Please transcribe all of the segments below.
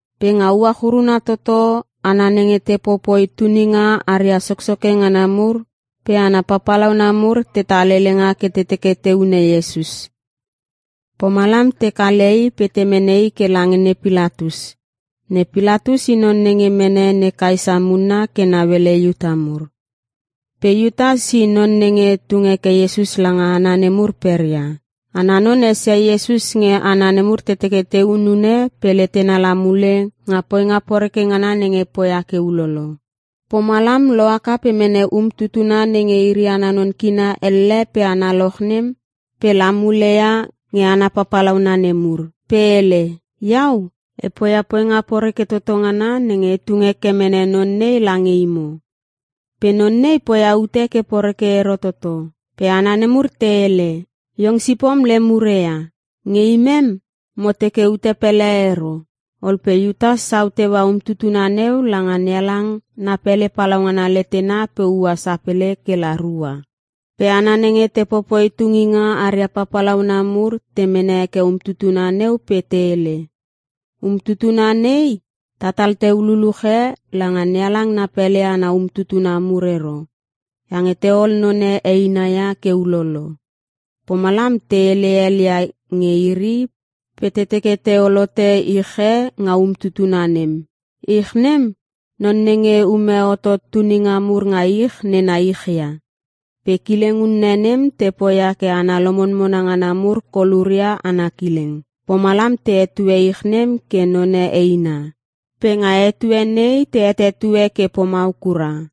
Pe nga uach uruna toto hana nenge te popoi tuninga aria soksoke ngana mur pe hana papalauna mur tetal helenga ke te teke te hune Iesus. Pomalam te kale I pe te mene I ke lange ne Pilatus. Ne Pilatus i non nenge mene ne Kaesa munna ke nauele Iuta mur. Pe Iutas, i non nenge tung heke Iesus langa hana nemur peria. Ana non esia Iesus nge hana nemur te teke te hunune pe letena la mule nga poinga poreke ngana nenge poia ke ulolo. Pomalam lohaka pe mene umtutuna nenge iri ana non kina elle pe analoch nem pe la mule ia nge hana papalauna nemur. Pe hele, “Iau, e poia poinga poreke toto ngana nenge e tung heke mene non nei lange imo. Pe non nei poia ute ke poreke ero toto.” Pe hana nemur te hele, “Iong sipom lem ure ia. Nge imem, mo teke ute pele ero.” Ol pe Iutas sau teua umtutuna neu langa NeHalang na pele palaungana letena pe ua sapele kela rua. Pe hana nenge te popoi tunginga aria papalauna mur te mene heke umtutuna neu pe te hele, “Umtutuna nei ta tal teu luluche langa NeHalang na pele ana umtutuna mur ero, iange te ol none eina ia ke ulolo.” Pomalam te hele hel ia nge iri pe te teke te ol hote ich e nga umtutuna nem. Ich nem non nenge ume hotot tuninga mur nga ich nena ich ia. Pe kileng unne nem te poia ke hana lomonmona ngana mur koluria ana kileng. Pomalam te hetue ich nem ke None Eina. Pe nga etue nei te hetetue ke pomau kura.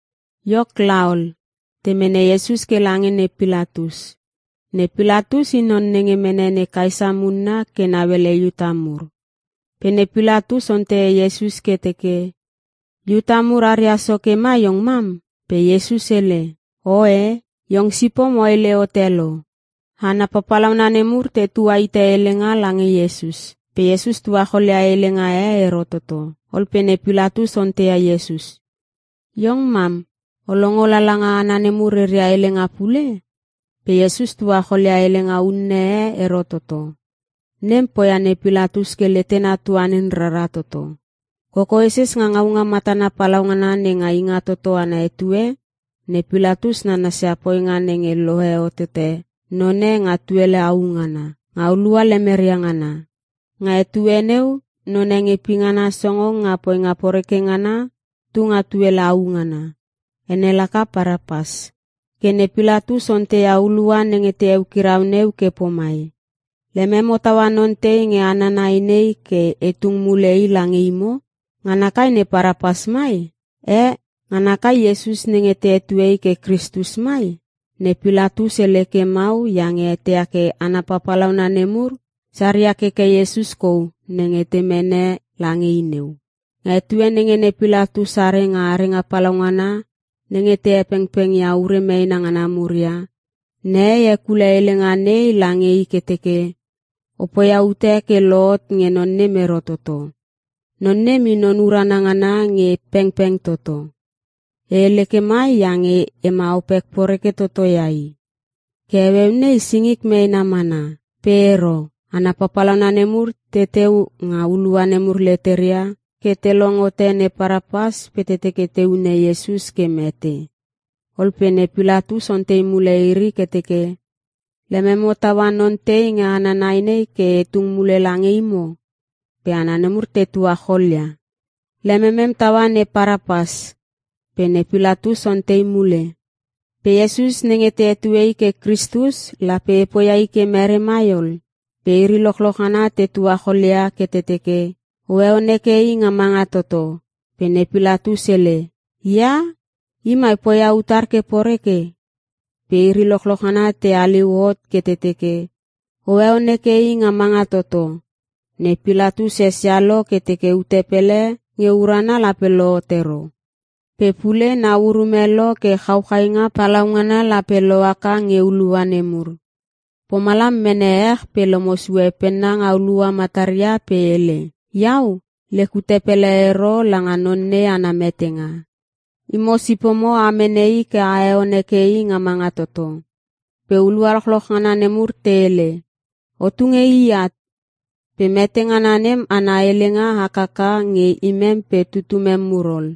Iok laol, te mene Iesus ke lange ne Pilatus. Ne Pilatus i non nenge mene ne Kaesa munna ke nauele Iuta mur. Pe ne Pilatus onteia Iesus ke teke, “Iuta mur aria soke ma iong mam?” Pe Iesus hele, “Oe, iong sipom o hele hote lo.” Hana papalauna nemur te tua hite helenga lange Iesus. Pe Iesus tuacholia helenga e ero toto. Ol pe ne Pilatus onteia Iesus, “Iong mam o longo lala nga hana nemur reria helenga pule?” Pe Iesus tuachol ia helenga unne e ero toto. Nem poia ne Pilatus ke letena tuanin rara toto. Kokoeses nga ngaunga matana palaungana nenga Ingatoto ana etue, ne Pilatus nananas ia poinga nenge lohe hotote none nga tuele au ngana, nga hulua lemeria ngana. Nga etue neu none nge pingana songong nga poinga poreke ngana tunga tuele au ngana. Ene laka Parapas. Ke ne Pilatus onteia hulua nenge te eukirau neu ke pomai, “Lememo taua non tei nge hana nai nei, ke e tung mule i lange imo? Ngana kai ne Parapas mai? Eh, Ngana kai Iesus nenge te hetue I ke Kristus mai?” Ne Pilatus hele ke mau iange eteia ke hana papalauna nemur saria keke Iesus kou nenge te mene lange i neu. Nga etue nenge ne Pilatus are nga arenga palaungana nenge te hepengpeng ure meena ngana mur ia, nehei hekule helenga nei lange i ke teke, “O poia ute ke lohot nge non nem ero toto. Non nem I non urana ngana nge pengpeng toto. E hele ke mai iange e ma opek poreke toto ia I. Ke heueu nei singik meena mana.” Pe ero. Hana papalauna nemur teteu nga hulua nemur leteria ke te long hote ne Parapas pe te teke te hune Iesus ke mete. Ol pe ne Pilatus ontei mule iri ke teke, “Lememo taua non tei nge hana nai nei ke e tung mule lange imo?” Pe hana nemur te tuacholia, “Lememem taua ne Parapas!” Pe ne Pilatus ontei mule, “Pe Iesus nenge te hetue I ke Kristus, lape e poia I ke mere mai ol?” Pe iri lochloch ngana te tuachol ia ke te teke, “O heon heke I nga manga toto!” Pe ne Pilatus hele, “Ia, i mai poia utar ke poreke?” Pe iri lochloch ngana te haliu hot ke te teke, “O heon heke I nga manga toto!” Ne Pilatus esia lo ke teke ute pele nge urana lape lohot ero. Pe pule nau urume lo ke chauchainga palaungana lape lohaka nge hulua nemur. Pomalam, mene ech pe lomo sue penna nga hulua mataria pe hele, “Iau lek ute pele ero langa non nei ana metenga. Imo sipomo a mene I ke a heon heke I nga manga toto.” Pe hulua lochloch ngana nemur te hele, “O tunge I at. Pe mete ngana nem ana helenga, hakaka nge imem pe tutumem mur ol!”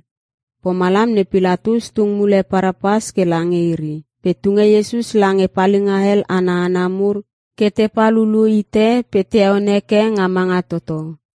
Pomalam ne Pilatus tung mule Parapas ke lange iri, pe tunge Iesus lange palinga hel ana hana mur ke te pal hulu hite pe te heon heke nga manga toto.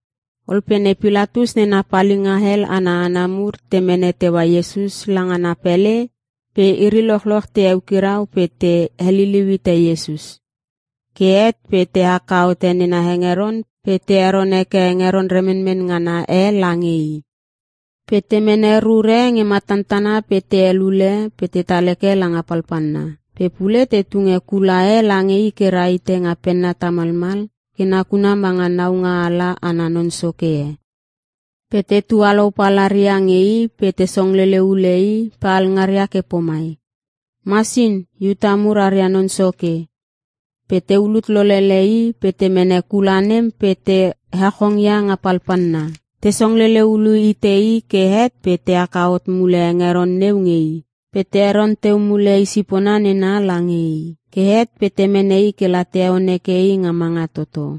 Ol pe ne Pilatus nena palinga hel ana hana mur te mene teua Iesus langa na pele pe iri lochoch te eukirau pe te heliliu hite Iesus. Ke het pe te haka hote nena hengeron pe te heron heke hengeron remenmen ngana e lange I. Pe te mene rur e nge matantana pe te helule, pe tetal heke langa palpalna. Pe pule te tunge kula e lange I ke rahite nga penna tamalmal ke nakuna manga naungaala ana non soke e. Pe te tualou palaria nge I pe te songlele hule I pe alngaria ke pomai, “Masin! Iuta mur aria non soke!” Pe te ulut lolele I pe te mene kula nem pe te hechongia nga palpalna. Te songlele hulu hite I ke het pe te haka hot mule hengeron neu nge I, pe te heron teu mule i sipona nena lange I. Ke het pe te mene I kela te heon heke I nga manga toto.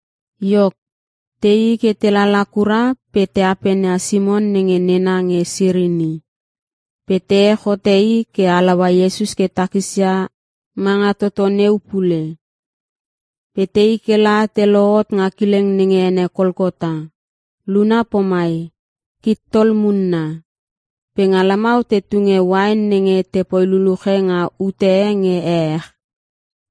Iok, teii ke te lala kura pe te apenia Simon nenge nena nge Sirini. Pe te ech hote i ke halaua Iesus ke takis ia manga toto neu pule. Pe tei kela te lohot nga kileng nenge ene Kolkota (Luna pomai, “Kittol Munna.”) Pe nga lamau te tunge uain nenge te poi luluche nga ute e nge ehech.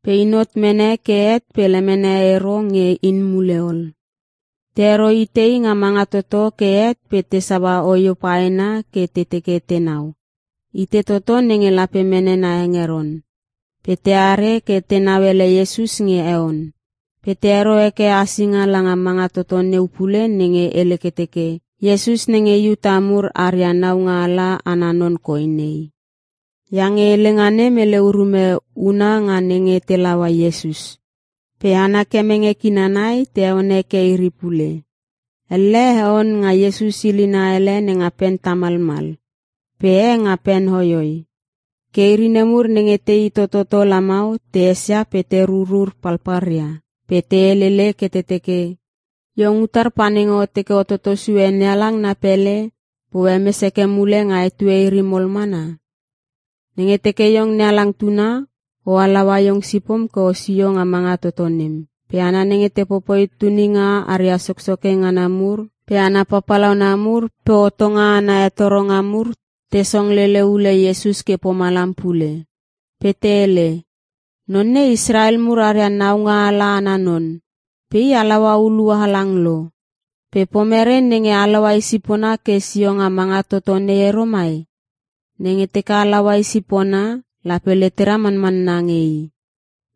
Pe in hot mene ke het pe lemene ero nge in mule ol. Te hero hite I nga manga toto ke het pe te saua oio paena ke te teke tenau, itei toto nenge lape mene na hengeron. Pe teare ke tenau ele Iesus nge heon. Pe te hero heke asinga langa manga toto neu pule nenge hele ke teke, “IESUS NENGE IUTA MUR ARIA NAUNGA ALA ANA NON KOI NEI.” Iange helenga nem hele urume huna nga nenge te laua Iesus. Pe hana kemenge kina nai, te heon heke iri pule. Elle heon nga Iesus hilina hele nenga pen tamalmal pe e nga pen hoihoi. Ke iri nemur nenge tei tototo lamau, te esia pe te rurur palpalria pe te helele ke te teke, “Iong utar pa nenge o teke o toto sue NeHalang na pele, pe o hemes heke mule nga etue iri mol mana? Nenge teke iong NeHalang tuna, O halaua Iong sipom ke osio nga manga toto nem!” Pe hana nenge te popoi tuninga aria soksoke ngana mur pe hana papalauna mur pe hotonga ana hetoronga mur, te song lele hule Iesus ke pomalam pule. Pe te hele, “Non nei Israel mur aria naungaala ana non. Pe I halaua hulua halang lo. Pe pomere nenge halaua i sipona ke sio nga manga toto nei ero mai?! Nenge teke halaua i sipona lape letera manmanna nge I.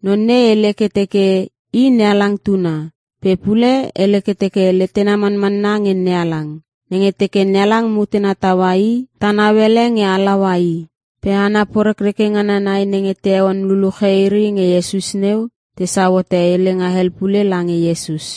Non nei hele ke teke I NeHalang tuna. Pe pule hele ke teke letena manmanna nge NeHalang. Nenge teke NeHalang mutena taua I, ta nauele nge halaua I.” Pe hana porekreke ngana nai nenge te heon luluche iri nge Iesus neu, tesau hote helenga hel pule lange Iesus.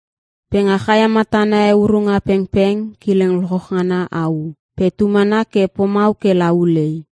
Pe nga chaia matana eurunga pengpeng, kileng lochloch ngana au. Pe tu mana ke pomau ke la ulei.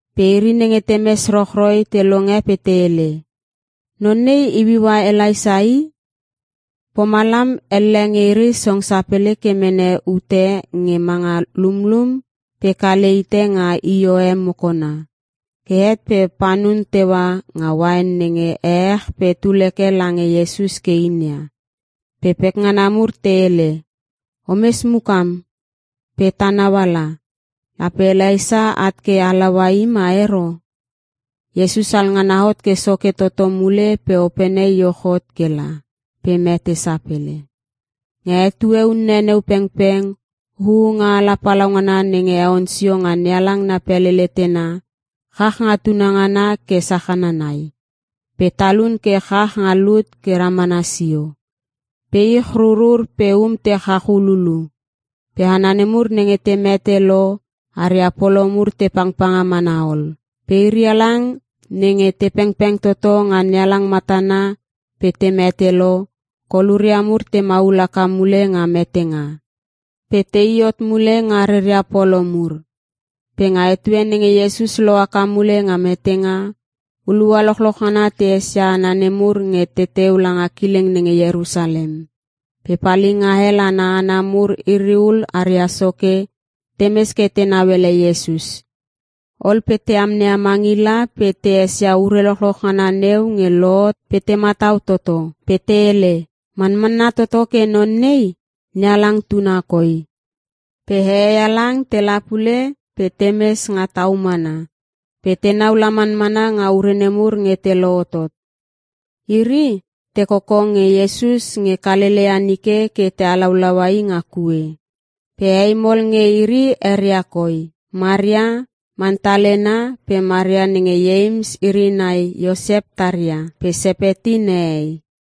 Pe iri nenge te mes rochroi, te longe pe te hele, “Non nei iuiua Elaisa i!” Pomalam elle nge iri song sapele ke mene ute nge manga lumlum pe kale hite nga io e mokona. Ke het pe panun teua nga uain nenge ehech pe tul heke lange Iesus ke inia. Pe pekngana mur te hele, “O mes mukam pe ta nauala. Lape Elaisa at ke halaua i ma ero!” Iesus alngana hot ke soke toto mule pe opene iuch hot kela, pe mete sapele. Nga etue unne neu pengpeng huunga ala palaungana nenge heon sio nga NeHalang na pele letena, chach nga tunangana ke sachana nai. Pe talun ke chach nga lut ke ramana sio. Pe ich rurur pe um te chach hululu. Pe hana nemur nenge te mete lo, aria polo mur te pangpanga mana ol. Pe iri halang nenge te pengpeng toto nga NeHalang matana pe te mete lo, koluria mur te maul haka mule nga metenga. Pe tei hot mule nga reia polo mur. Pe nga etue nenge Iesus lohaka mule nga metenga, hulua lochloch ngana te esia hana nemur nge teteu langa kileng nenge Ierusalem. Pe palinga hel ana hana mur iri ul aria soke, te mes ke tenau ele Iesus. Ol pe te amneia mangila pe te esia ure lochloch ngana neu nge lohot pe te matau toto. Pe te hele, “Manmanna toto ke Non nei, NeHalang Tuna koi.” Pe hehei halang tela pule pe te mes nga tau mana, pe tenau la manmana nga ure nemur nge te lohotot. Iri, te koko nge Iesus nge Kalelea nike ke te halaulaua I nga kue. Pe hei mol nge iri eria koi: Maria Mantalena pe Maria nenge Ieims iri nai Iosep taria pe Sepeti nehei.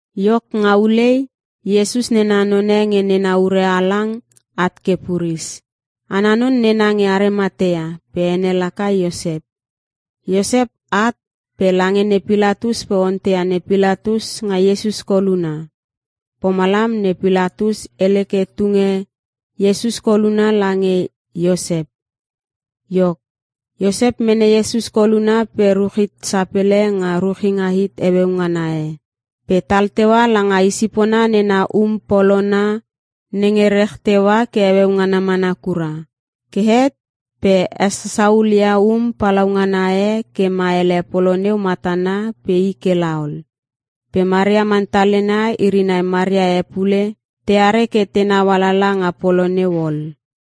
Iok nga ulei, Iesus nena none nge nena ure halang at ke puris. Ana non nena nge Arimatea pe ene laka Iosep. Iosep at pe lange ne Pilatus pe onteia ne Pilatus nga Iesus koluna. Pomalam ne Pilatus hele ke te tunge Iesus koluna lange Iosep. Iok, Iosep mene Iesus koluna pe ruch hit sapele nga ruchinga hit heueu ngana e, pe tal teua langa isipona nena um polona nenge rech teua ke heueu ngana mana kura. Ke het pe hesasaul ia um palaungana e ke ma ele polo neu matana pe i ke laol. Pe Maria Mantalena iri nai Maria e pule teare ke tenau alala nga polo neu ol.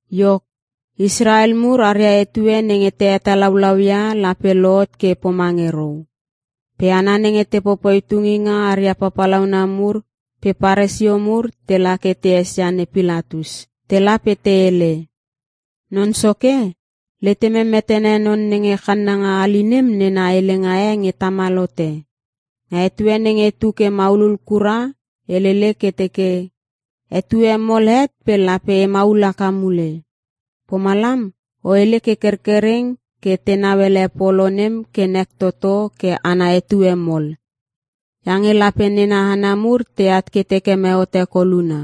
Iok, Israel mur aria etue nenge te hetalaulauia lape lohot ke pomange rou. Pe hana nenge te popoi tunginga aria papalauna mur pe Paresio mur, tela ke te esia ne Pilatus. Tela pe te hele, “Non soke, letemem metene non nenge channanga hali nem nena helenga e nge tamal hote. Nga etue nenge tu ke maulul kura helele ke teke, ‘Etue mol het pe lape e maul haka mule.’ Pomalam o hele ke kerkereng ke tenau ele polo nem ke nek toto ke ana etue mol. Iange lape nena hana mur teat ke te keme hote koluna.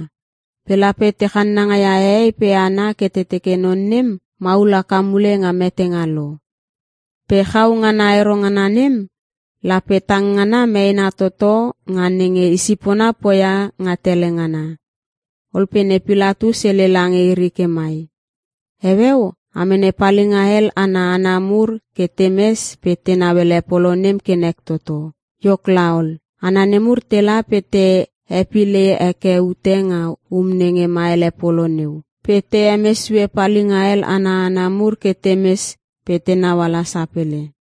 Pe lape te channanga ia hehei pe hana ke te teke non nem, maul haka mule nga metenga lo. Pe chau ngana ero ngana nem, lape tang ngana meena toto nga nenge Isipona poia nga tele ngana.” Ol pe ne Pilatus hele lange iri ke mai, “Heueu a mene palinga hel ana hana mur ke te mes pe tenau ele polo nem ke nek toto.” Iok laol, hana nemur tela pe te hepile heke ute nga um nenge ma hele polo neu, pe te hemes sue palinga hel ana hana mur ke te mes pe tenau ala sapele.